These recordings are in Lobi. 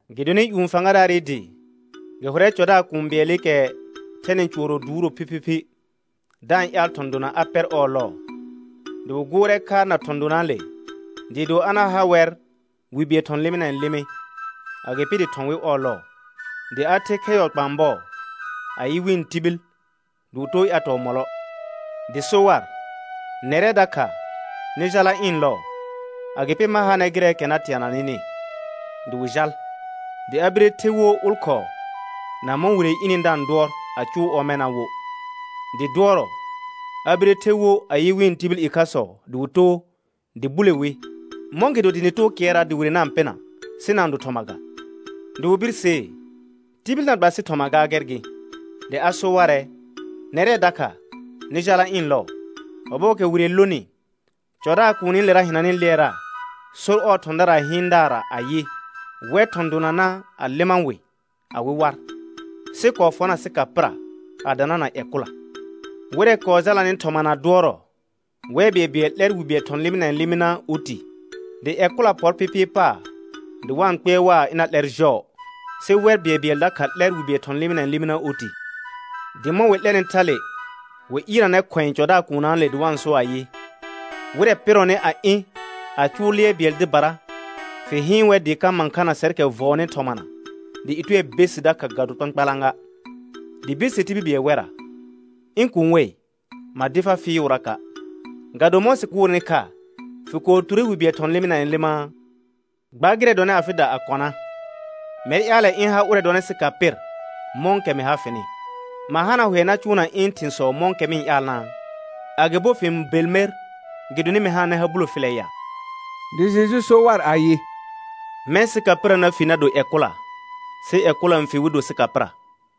Gɩdonɩ ƴũ fãgadaarɩ dɩ gɩ hʋrɛ cɔdaar kũu bɩɛlɩkɛ thɛnɩ cʋɔrɔ duuro phiphiphi, da-n ƴaal thɔ̃ dona a pɛr ɔɔ lɔɔ. Dɩ wɩ gʋʋrɛ kha na thɔ̃ donaale dɩɩ do a na ha wɛr wi bɩɛl thɔ̃ lɩmɩnɛɛ lɩmɩ, agɩpɩ dɩ thɔ̃ wɩ ɔɔ lɔɔ. Dɩ a ther khɛ yɔ kpãa bɔɔ a yɩ wɩ̃ tibil, dɩ wɩ too ƴatɔɔ mɔlɔ. Dɩ so war: Nɛrɛ dakha, nɩ jala ɩ̃ lɔɔ, agɩpɩ ma ha nɛr gɩrɛɛkɛ na teana nɩnɩ. Dɩ wɩ jal. Dɩ a bire the wo ʋlkhɔɔ na mɔ̃ wire ɩnɩ da-n dʋɔr a cʋʋ ɔmɛna wo. Dɩ dʋɔrɔ a bire the wo a yɩ wɩ̃ tibil ɩkhasɔ dɩ wɩ too, dɩ bule wi. Mɔ̃gɩdo dɩ nɩ too kɩɛrra dɩ wire na-n pɩna, sɩ na-n do thɔma ga. Dɩ wɩ birsee: Tibil na gba sɩ thɔma ga, gɛr gɩ. Dɩ a so warɛ: Nɛrɛ dakha, nɩ jala ɩ̃ lɔɔ. Ɔbɔɔkɛ wire n lonɩ, cɔdaar kuunilera hɩnanɩ lɩɛra sor ɔɔ thɔ̃daraa hɩɩndaarra ayɩ: Wɛ thɔ̃ donana a lɩma wɩ awɩ war, sɩ kɔɔ fɔna sɩka pɩra a danana ƴɛ kʋla. Wɩrɛ kɔɔ jalanɩ thɔmana dʋɔrɔ, wɛr bɩɛlbɩɛl 'lɛr wi bɩɛl thɔ̃ lɩmɩnɛɛ lɩmɩna oti. Dɩ ƴɛ kʋla pɔr pɩpɩɩ paar dɩ wa-n kpɩɛr waa, ɩna 'lɛr jɔɔ, sɩ wɛr bɩɛlbɩɛl dakha 'lɛr wi bɩɛl thɔ̃ lɩmɩnɛɛ lɩmɩna oti. Dɩ mɔ̃ wɩ 'lɛnɩ thale, wɩ ɩɩrnanɛ khʋ̃ɛ cɔdaar kuunnaale dɩ wa-n so ayɩ: Wɩrɛ pɩrɔnɩ a ɩ̃ a cʋʋ lɩɛr bɩɛl dɩbara, fɩ hɩɩn wɛr dɩɩ ka mãkhana sɛrkɛ vɔɔnɩ thɔmana, dɩ ɩtʋɛ be sɩ dakha ga do kpãkpalã ga. Dɩ birse tibil bɩɛl wɛrra: Ɩ̃ kuun wei, ma dɩ far fɩɩʋraka'. Ga do mɔ̃ sɩ gʋʋrnɩ kha fɩ kɔɔ ture wi bɩɛl thɔ̃ lɩmɩnɛɛ lɩmaa? Gba gɩrɛ dɔnɩ afɩda a kɔna. Mɛr ƴaalɛ ɩ̃ ha ʋrɛ dɔnɩ sɩka pɩr mɔ̃kɛ mɩ ha fɩnɩ. Ma hana hʋɛ na cʋʋna ɩ̃ thɩ̃sɔ mɔ̃kɛ mɩ-n ƴaalnaa? Agɩbo fɩ-n bel mer gɩdonɩ mɩ hananɛ ha bulo filɛ ya? Dɩ Jeju so war ayɩ: Mɛ̃ sɩka pɩra na fi na do ƴɛ kʋla, sɩ ƴɛ kʋla n fi wɩ do sɩka pɩra.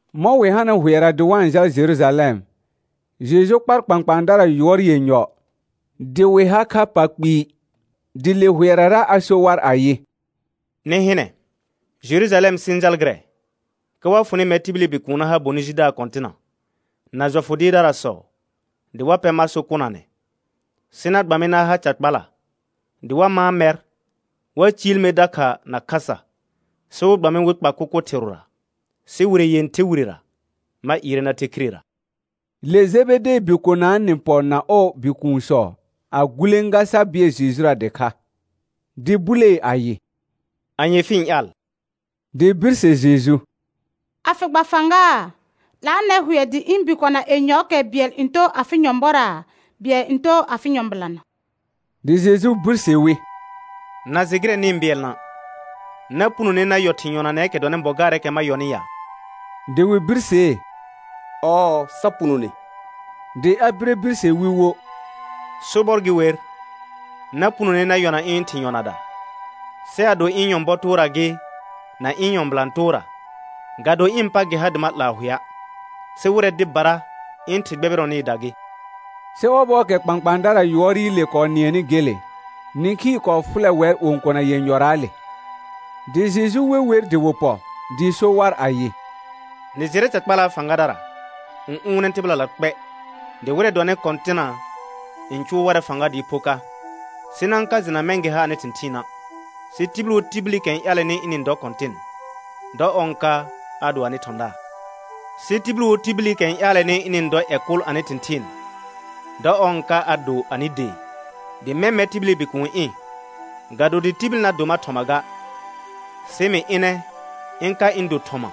Mɔ̃ wɩ hanɩ hʋɛra dɩ wa-n jal Jerujalɛm, Jeju kpar kpãkpãadara yʋɔr yenyɔ dɩ wɩ ha kha pa kpɩɩ, dɩ le hʋɛrara a so war ayɩ: Nɩ hɩnɛ, Jerujalɛm sɩ-n jal gɩrɛ, ka wa fʋnɩ mɛr tibili Bikuun na ha bonɩ jidaar kɔ̃tɩna, na jɔfʋ dɩɩrdarasɔ, dɩ wa pɛ mar so kʋnanɛ, sɩ na gba mɩ na ha ca kpala, dɩ wa mãa mɛr, wa ciil mer dakha na khasa, sɩ wɩ gba mɩ wɩ kpa kʋkʋ thɩrʋra. Sɩ wire yẽther wirera ma ɩɩrɛ na the khirera. Le Jebedee bikonaa nɩ pɔ na ɔɔ bikuunsɔ a gulẽga sa bɩɛl Jejura dɩkha. Dɩ bulee ayɩ: Anye fɩ-n ƴaal? Dɩ birse Jeju: A fɩ gba fãga, 'laanɛ hʋɛ dɩ ɩ̃ bikona yenyɔɔkɛ bɩɛl n too afɩ nyɔ̃bɔra, bɩɛl n too afɩ nyɔ̃bɩlana. Dɩ Jeju birse wi: Na jɩ gɩrɛ nɩ-n bɩɛlna'. Na punone na yɔ thɩ̃ yɔnanɛɛkɛ dɔnɩ bɔ gaarɛɛkɛ ma yɔnɩ ya? Dɩ wɩ birsee: Ɔɔ, sa punone. Dɩ a bire birse wi wo: Sobɔr gɩ wer, na punone na yɔna ɩ̃ thɩ̃ yɔnada. Sɩ ado ɩ̃ nyɔ̃bɔ toora gɩ, na ɩ̃ nyɔ̃bɩlã toora, ga do ɩ̃ pa gɩ ha dɩ ma 'laa hʋɛa', sɩ wɩrɛ dɩbara ɩ̃ Thɩ gbɛbɩrɔnɩɩda gɩ. Sɩ ɔbɔɔkɛ kpãkpãadara yʋɔrɩle kɔɔ nɩɛnɩ gele, nĩkhii kɔɔ fʋlɛ wɛr õkona yenyɔraale. Dɩ Jeju we wer dɩ wɩ pɔ, dɩ so war ayɩ: Nɩ jɩrɛ dɩ ca kpalaa fãgadara n ʋʋnɛ tɩbɩlala kpɛ, dɩ wɩrɛ dɔnɩ kɔ̃tɩna n cʋʋ warɛ fãga dɩɩ pho ka. Sɩ na-n ka jɩna mɛ̃ gɩ ha anɩ thɩ̃thɩɩna'. Sɩ tibil wo tibilikɛ n ƴaalɛnɩ ɩnɩ-n dɔ kɔ̃tɩn, dɔ ɔr n ka a do anɩ thɔ̃daar. Sɩ tibil wo tibilikɛ n ƴaalɛnɩ ɩnɩ-n dɔ ƴɛ kʋl anɩ thɩ̃thɩɩn, dɔ ɔr n ka a do anɩ dee. Dɩ mɛ̃ mɛr tibili Bikuun ɩ̃, ga do dɩ tibil na do mar thɔma ga, sɩ mɩ ɩnɛ ɩ̃ ka ɩ̃ do thɔma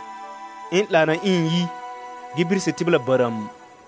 ɩ̃ 'laana ɩ̃ yi gɩ birse tɩbɩla bərəəm.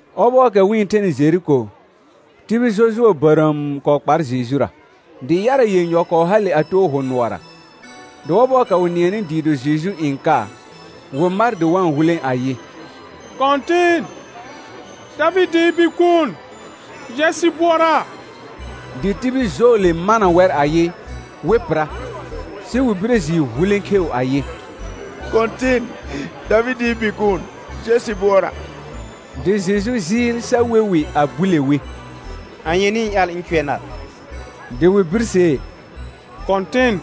Ɔbɔɔkɛ wɩ-n thenɩ Jeriko, tibil jɔjʋɔ bərəəm kɔɔ kpar Jejura. Dɩ yara yenyɔ kɔɔ hale a too hʋ nʋɔra. Dɩ ɔbɔɔkɛ wɩ nɩɛnɩ dɩɩ do Jeju n ka, wɩ mar dɩ wa-n hulẽ ayɩ: Kɔ̃tɩn, Davɩdɩɩ Bikuun, jɛ sɩ bʋɔra. Dɩ tibi. jɔɔle mana wɛr ayɩ, wɩ pɩra. Sɩ wɩ bire jɩɩ hulẽ kheu ayɩ: Kɔ̃tɩn, Davɩdɩɩ Bikuun, jɛ sɩ bʋɔra. Dɩ Jeju jɩɩl sa we wɩ a bule wi: Anye nɩ-n ƴaal ɩ̃ cʋɛ nar? Dɩ wɩ birsee: Kɔ̃tɩn,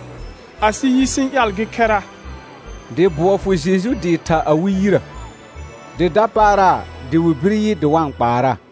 asɩ yi sɩ-n ƴaal gɩ khɛra. Dɩ bʋɔ fʋ Jeju dɩ tha awɩ yirə, dɩ dapaara dɩ wɩ bir yɩ dɩ wa-n kpaaraa.